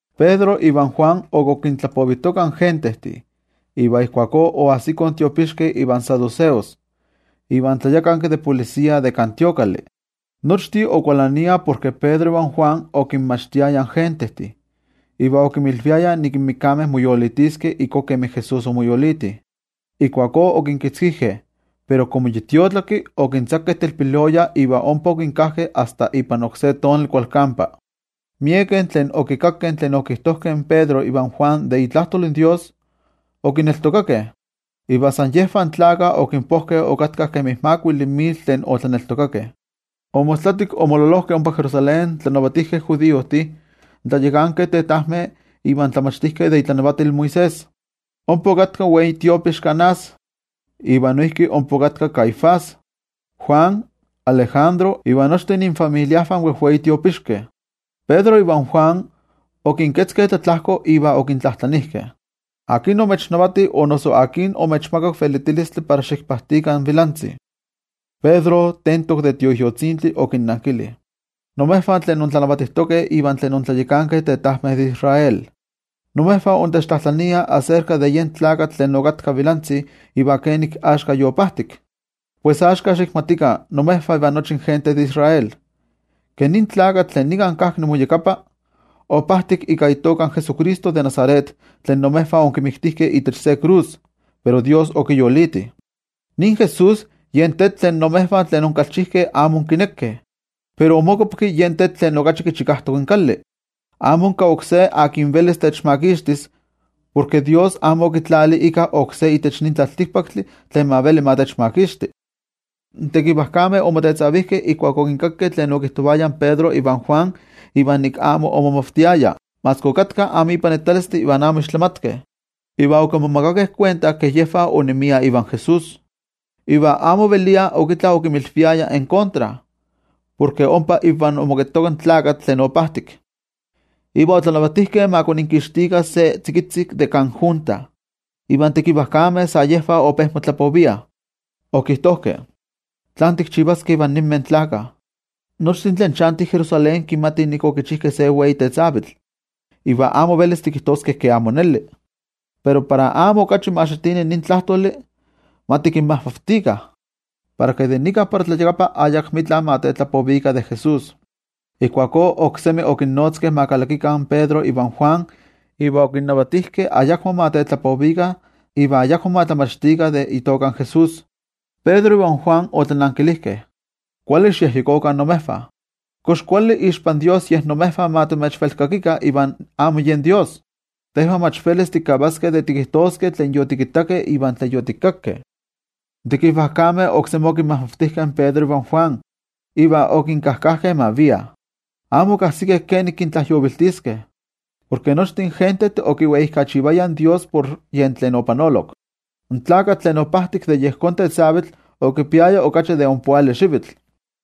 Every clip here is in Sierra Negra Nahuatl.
Pedro ivan Juan ok okintlapovijtokah in gentejtih, iva ijkuakó oajsikoh in tiopixkeh iva saduceos, iva in tlayakanki de templojmayoltih. Nochtin okualaniah porke Pedro ivan Juan okinmachtiayah in gentejtih, iva okinmilviayah nik in mikameh moyolitiskeh ijkó kemi Jesús omoyoliti. Ijkuakó okinkitzkijkeh, pero komo yi tiotlaki, okintzakeh telpiloya iva ompa okinkajtejkeh asta ipan oksé tonali kualkampa. Miekeh tlen okikakkeh tlen okijtojkeh in Pedro ivan Juan de itlajtol in Dios, okineltokakeh. Iva san yejvah tlakah okinpojkeh okatkah kemi makuili mil tlen otlaneltokakeh. Omostlatik omololojkeh ompa Jerusalén in tlanavatijkeh judiojtih, in tlayakankeh tetajmeh iva in tlamachtijkeh de itlanavatil Moisés. Ompa okatka in wei tiopixki Anás, iva noijki ompa okatka Caifás, Juan, Alejandro, iva nochtin infamiliajvah in wejwei tiopixkeh. Pedro ivan Juan okinketzkeh tlatlajko iva okintlajtlanijkeh: —¿Akin omechanavati, o noso akin omechmakak velitilistli para xikpajtikah in vilantzi? Pedro tentok de Tioijyotzintli okinnankili: —Imejvah tlen intlanavatijtokeh iva tlen intlayakankeh tetajmeh de Israel: imejvah intechtlajtlaniah aserka de yen tlakatl tlen okatka vilantzi iva kenik axka yopajtik. Pues axka, xikmatikah imejvah iva nochi gente de Israel, ke nin tlakatl tlen nika kajki inmoyakapa, opajtik ika itoka in Jesucristo de Nazaret, tlen imejvah onkimiktijkeh itech se krus, pero toYejwatzi okiyoliti. Nin Jesús, yen “tetl tlen imejvah tlen inkalchijkeh amo onkinekeh, pero omokopki yen tetl tlen okachi kichikajtok in kali.” Amo onka oksé tlen velis techmakixtis, porke toYejwatzi amo okitlali íkka oksé itech nin tlaltikpaktli tlen ma veli ma techmakixti. In tekivajkameh omotetzavijkeh ijkuak okinkakkeh tlen okijtovayah in Pedro ivan Juan iva nik amo omomavtiayah, maski okatkah amo ipanitalistih iva amo ixtlamatkeh. Iva okimomakakeh kuenta ke yejvah onemiah ivan Jesús. Iva amo ovelia ok itla okinmilviayah en kontra, porke ompa invah omoketoka in tlakatl tlen opajtik. Iva otlanavatijkeh ma koninkixtikah se tzikitzi de kan junta, iva in tekivajkameh sa yejvah ope motlapoviah. Okijtojkeh: —¿Tlán tikchivaskeh ivan ninmeh tlakah? Nochtin tlen chantih Jerusalén kimatih nik okichijkeh se wei tetzavkaneskayotl, iva amo velis tikijtoskeh ke amo neli. Pero para amo okachi ma xitini nin tlajtoli, ma tikinmajmavtikah, para ke de nika para tlayakapa ayakmika ma kitlapovikah de Jesús. Ijkuakó oksemi okinnotzkeh ma kalakikah in Pedro ivan Juan iva okinnavatijkeh ayakmo ma tetlapovikah iva ayakmo ma tlamachtikah de itoka in Jesús. Pedro ivan Juan otlanankilijkeh: —Kuali xikyejyekokah imejvah, kox kuali ixpan toYejwatzi yej imejvah ma timechvelkakikah iva amo yen toYejwatzi. Tejvah mach velis tikavaskeh de tikijtoskeh tlen yotikittakeh iva tlen yotikakkeh. In tekivajkameh oksemi okinmajmavtijkeh in Pedro ivan Juan iva okinkajkajkeh ma viah. Amo okajsikeh kenik kintlajyoviltiskeh, porke nochtin gentejtih okiweijkachivayah in Dios por tlen opanolok. In tlakatl tlen opajtik de yejón tetzavitl okipiaya okachi de ompoali xivitl.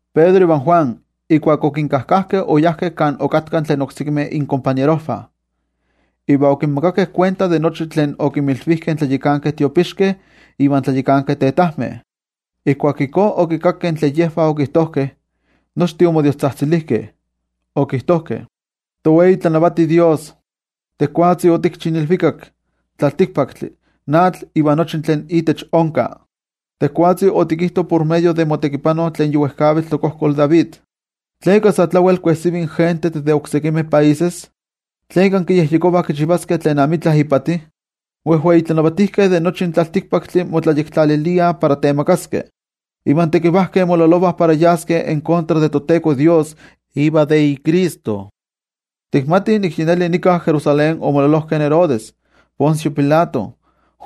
Pedro ivan Juan, ijkuak okinkajkajkeh, oyajkeh kan okatkah tlen oksekimeh inkompañerojvah, iva okinmakakeh kuenta de nochi tlen okinmilvijkeh in tlayakankeh tiopixkeh iva in tlayakankeh tetajmeh. Ijkuak ijkó okikakkeh tlen yejvah okijtojkeh, nochtin omodiostzajtzilijkeh okijtojkeh: —Towei tlanavati Dios, tejwatzi otikchi in ilvikak, in tlaltikpaktli, in atl iva nochi tlen intech onka. Tejwatzi otikijto por medio de motekipano tlen yi wejkavitl tokojkol David: ¿Tleka sa tlawel kuejsivih in gentejtih de oksekimeh países? ¿Tleka kiyejyekovah kichivaskeh tlen amitla ipati? In wejwei tlanavatijkeh de nochi in tlaltikpaktli motlayektlaliliah para temagaskeh, iva in tekivajkeh mololovah para yaskeh en kontra de toTeko Dios iva de iCristo. ’Tikmatih nik yi neli nika Jerusalén omololojkeh in Herodes, in Poncio Pilato, in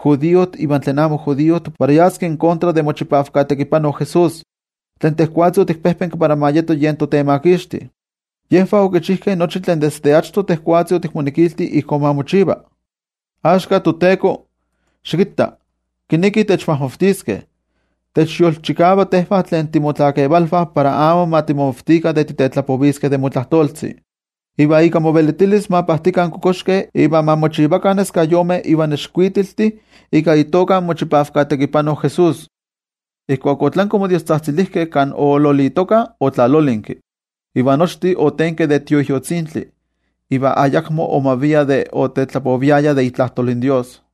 judiojtih ivan tlen amo judiojtih para yaskeh en kontra de mochipavka tekipano Jesús, tlen tejwatzi otikpejpenki para ma yeto yen toTemakixti. Yejvah okichijkeh nochi tlen desde achto tejwatzi otikmonekilti ijkó ma mochiva. Axka toTeko, xikitta kinekih techmajmavtiskeh. Techyolchikava tejvah tlen timotlakevalvah para amo ma timomavtikah de titetlapoviskeh de motlajtoltzi. Iva ika movelitilis ma pajtikah in kokoxkeh iva ma mochivakah neskayomeh iva nexkuitiltih ika itoka in mochipavka tekipano Jesús. Ijkuak otlanki omodiostzajtzilijkeh, kan oololitokah otlalolinki, iva nochtin otenkeh de Tioijyotzintli, iva ayakmo omaviah de otetlapoviayah de itlajtol in Dios.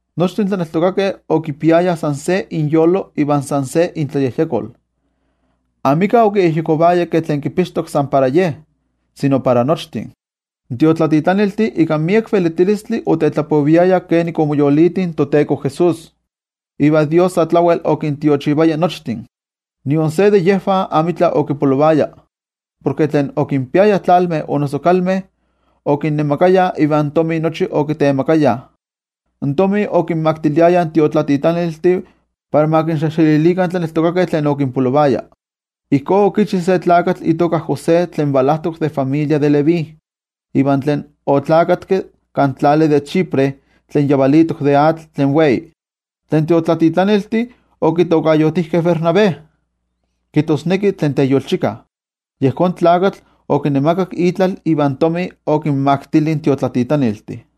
Nochtin tlaneltokakeh okipiayah san se inyolo iva san se intlayejyekol. Amika okiyejyekovaya ke tlen kipixtok san para ye, sino para nochtin. In tiotlatitlaniltih ika miek velitilistli otetlapoviayah kenik omoyoliti in toTeko Jesús, iva Dios sa tlawel okintiochivaya nochtin. Nion se de yejvah amitla okipolovaya, porke tlen okinpiayah tlalmeh o noso kalmeh, okinnemakayah ivan tomi nochi okitemakayah. In tomi okinmaktiliayah in tiotlatitlaniltih, para ma kinxejxelilikah in tlaneltokakeh tlen okinpolovaya. Ijkó okichi se tlakatl itoka José, tlen valajtok familia de Leví iva tlen oneski kan tlali de Chipre tlen yavalitok de atl tlen wei, tlen tiotlatitlaniltih okitokayotijkeh Bernabé, kijtosneki tlen teyolchika. Yejón tlakatl okinemakak itlal ivan tomi okinmaktili in tiotlatitlaniltih.